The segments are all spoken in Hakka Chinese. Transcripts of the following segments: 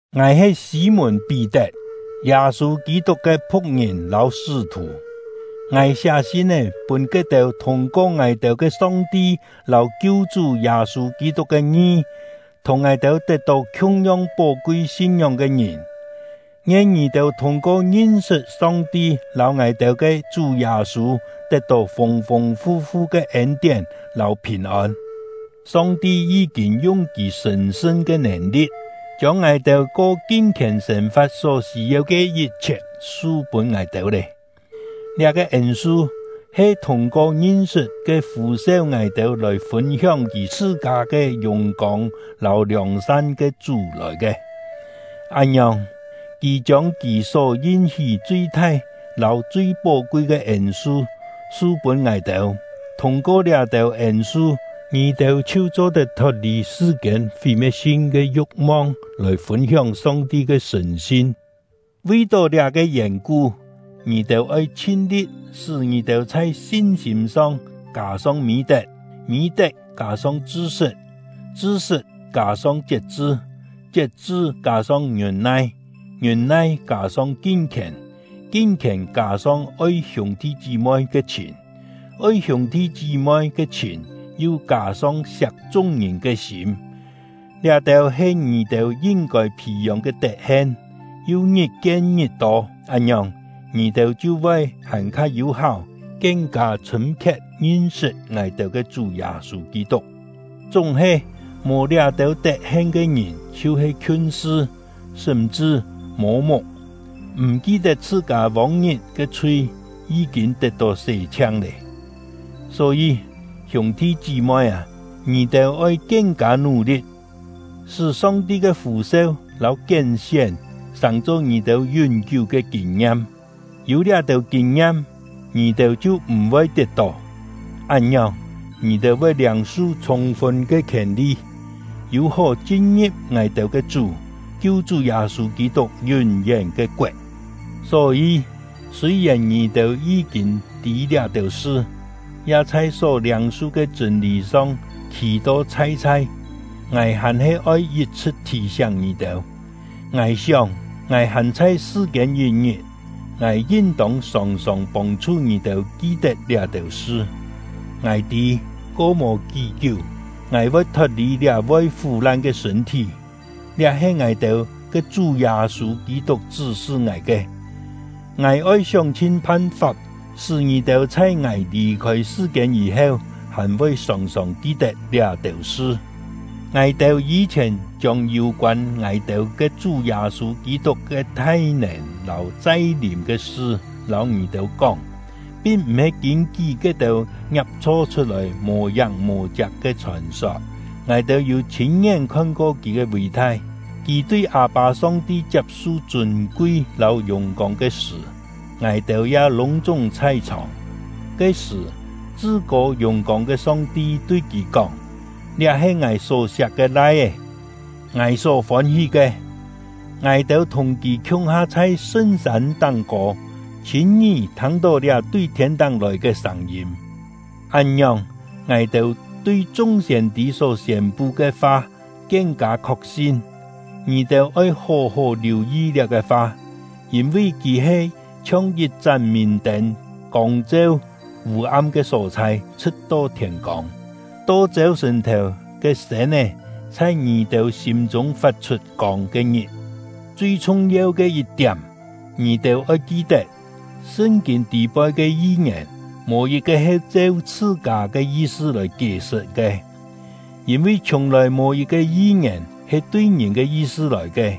Ngài he Sî-mùn-Pí-tet, Yâ-sû Kî-tuk ke phu̍k-ngìn lâu sṳ́-thù. Ngài siá sin-é pûn ke-têu thûng-ko ngài-têu ke Song-ti lâu Kiu-chú Yâ-sû Kî-tuk ke ngi, thùng ngài-têu tet-tó khiung-yong pó-kui sin-ngióng ke ngìn: Ngien ngì-têu thûng-ko ngin-sṳt Song-ti lâu ngài-têu ke Chú Yâ-sû tet-tó fûng-fûng fu-fu ke ên-tién lâu phìn-ôn! Song-ti yí-kîn yung Kì sṳ̀n-sṳn ke nèn-li̍t, chiông ngài-têu ko kin-khièn sên-fa̍t só sî-yeu ke yit-chhiet su pûn ngài-têu lé; liá-ke ên-su he thûng-ko ngin-sṳt ke fû-seu ngài-têu lòi fûn-hióng Kì chhṳ-kâ ke yùng-kông lâu liòng-san ke Chú lòi ke. Án-ngiòng, Kì chiông Kì só yin-hí chui thai lâu chui pó-kui ke ên-su su pûn ngài-têu; thûng-ko liá-têu ên-su, ngì-têu chhiu cho-tet thot-lì sṳ-kiên fí-me̍t-sin ke yu̍k-mong, lòi fûn-hióng Song-ti ke sṳ̀n-sin. Vi-tó liá-ke yèn-ku, ngì-têu oi chhin-li̍t sṳ́ ngì-têu chhai sin-sîm song kâ-song mî-tet, mî-tet kâ-song chṳ-sṳt, chṳ-sṳt kâ-song chiet-chṳ, chiet-chṳ kâ-song ngiûn-nai, ngiûn-nai kâ-song kin-khièn, kin-khièn kâ-song oi hiûng-thi chí-moi ke chhìn, oi hiûng-thi chí-moi ke chhìn yu kâ-song siak chung-ngìn ke sîm. Liá-têu he ngì-têu yin-kôi phì-yông ke tet-hen, yu ngit-kien ngit-tô; án-ngiòng, ngì-têu chhiu voi hàn-kha yû-háu, kien-kâ chhṳ̂m-khiet ngin-sṳt ngài-têu ke Chú Yâ-sû Kî-tuk. Chúng-he, mò liá-têu tet-hen ke ngìn chhiu-he khiun-sṳ, sṳm-chṳ mô-muk, m̀ ki-tet chhṳ-kâ vông-ngit ke chhui yí-kîn tet-tó sé-chhiang lé. Só-yî, hiûng-thi chí-moi â, ngì-têu oi kien-kâ nú-li̍t, sṳ́ Song-ti ke fû-seu lâu kién-sién sàng-cho ngì-têu yún-kiú ke kîn-ngiam; yû liá-têu kîn-ngiam, ngì-têu chhiu m̀-voi tiet-tó. Án-ngiòng, ngì-têu voi liâng-su chhûng-fun ke khièn-li, yû-hó chin-ngi̍p ngài-têu ke Chú — Kiu-chú Yâ-sû Kî-tuk yún-yén ke koet. Só-yî, sûi-yèn ngì-têu yí-kîn tî liá-têu sṳ, ya chhai só liâng-su ke chṳ̂n-lî song khî-to chhai-chhai, ngài hàn-he oi yit-chhṳ̍t thì-siáng ngì-têu. Ngài sióng, ngài hàn chhai sṳ-kiên yit-ngit, ngài yin-tông sòng-sòng pông-chhu ngì-têu ki-tet liá-têu sṳ. Ngài tî, ko mò kí-kiú, ngài voi thot-lì liá voi fú-lan ke sṳ̂n-thí; liá he ngài-têu ke Chú Yâ-sû Kî-tuk chṳ́-sṳ ngài ke. Ngài oi sióng-chhin phan-fap sṳ́ ngì-têu chhai ngài lì-khôi sṳ-kiên yî-heu hàn voi sòng-sòng ki-tet liá-têu sṳ. Ngài-têu yî-chhièn chiông yû-koân ngài-têu ke Chú Yâ-sû Kî-tuk ke thai-nèn lâu chai-lìm ke sṳ lâu ngì-têu kóng, pin m̀-he kîn-kí ke-têu ngiap-chho chhut-lòi mò-yáng mò-chiak ke chhòn-sot. Ngài-têu yû chhîn-ngién khon-ko kì ke ví-thai. Kì tui Â-pâ Song-ti chiap-su chûn-kui lâu yùng-kông ke sṳ̀, ngài-têu ya lûng-chúng chhai-chhòng. Ke-sṳ̀, Chṳ-kô Yùng-kông ke Song-ti tui kì kóng: “Liá he Ngài só-siak ke Lai-é, Ngài só fôn-hí ke.” Ngài-têu thùng kì khiung-ha chhai sṳn-sân táng-kô, chhîn-ngí thâng-tó liá tui thiên-táng lòi ke sâng-yîm. Án-ngiòng, ngài-têu tui chung siên-tî só siên-pu ke fa kien-kâ khok-sin. Ngì-têu oi hó-hó liù-yi liá-ke fa; yîn-vi kì he chhiong yit-chán mìn-tên kông-cheu vû-am ke só-chhai, chhṳ̍t-to thiên-kông, to chêu-sṳ̀n-thèu ke sên-é chhai ngì-têu sîm-chûng fat-chhut kông ke-ngit. Chui chhung-yeu ke yit-tiám, ngì-têu oi ki-tet: Sṳn-kîn tî-poi ke yi-ngièn, mò yit-ke he cheu chhṳ-kâ “chhṳ-kâ” ya-he yi̍t-cho “siên-tî chhṳ-kâ”. ke yi-sṳ lòi kié-sṳt ke; yîn-vi, chhiùng-lòi mò yit-ke yi-ngièn he tui ngìn ke yi-sṳ lòi ke,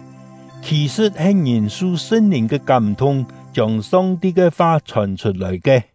khì-sṳ̍t he ngìn su Sṳn-Lìn ke kám-thung chiông Song-ti ke fa chhòn chhut-lòi ke.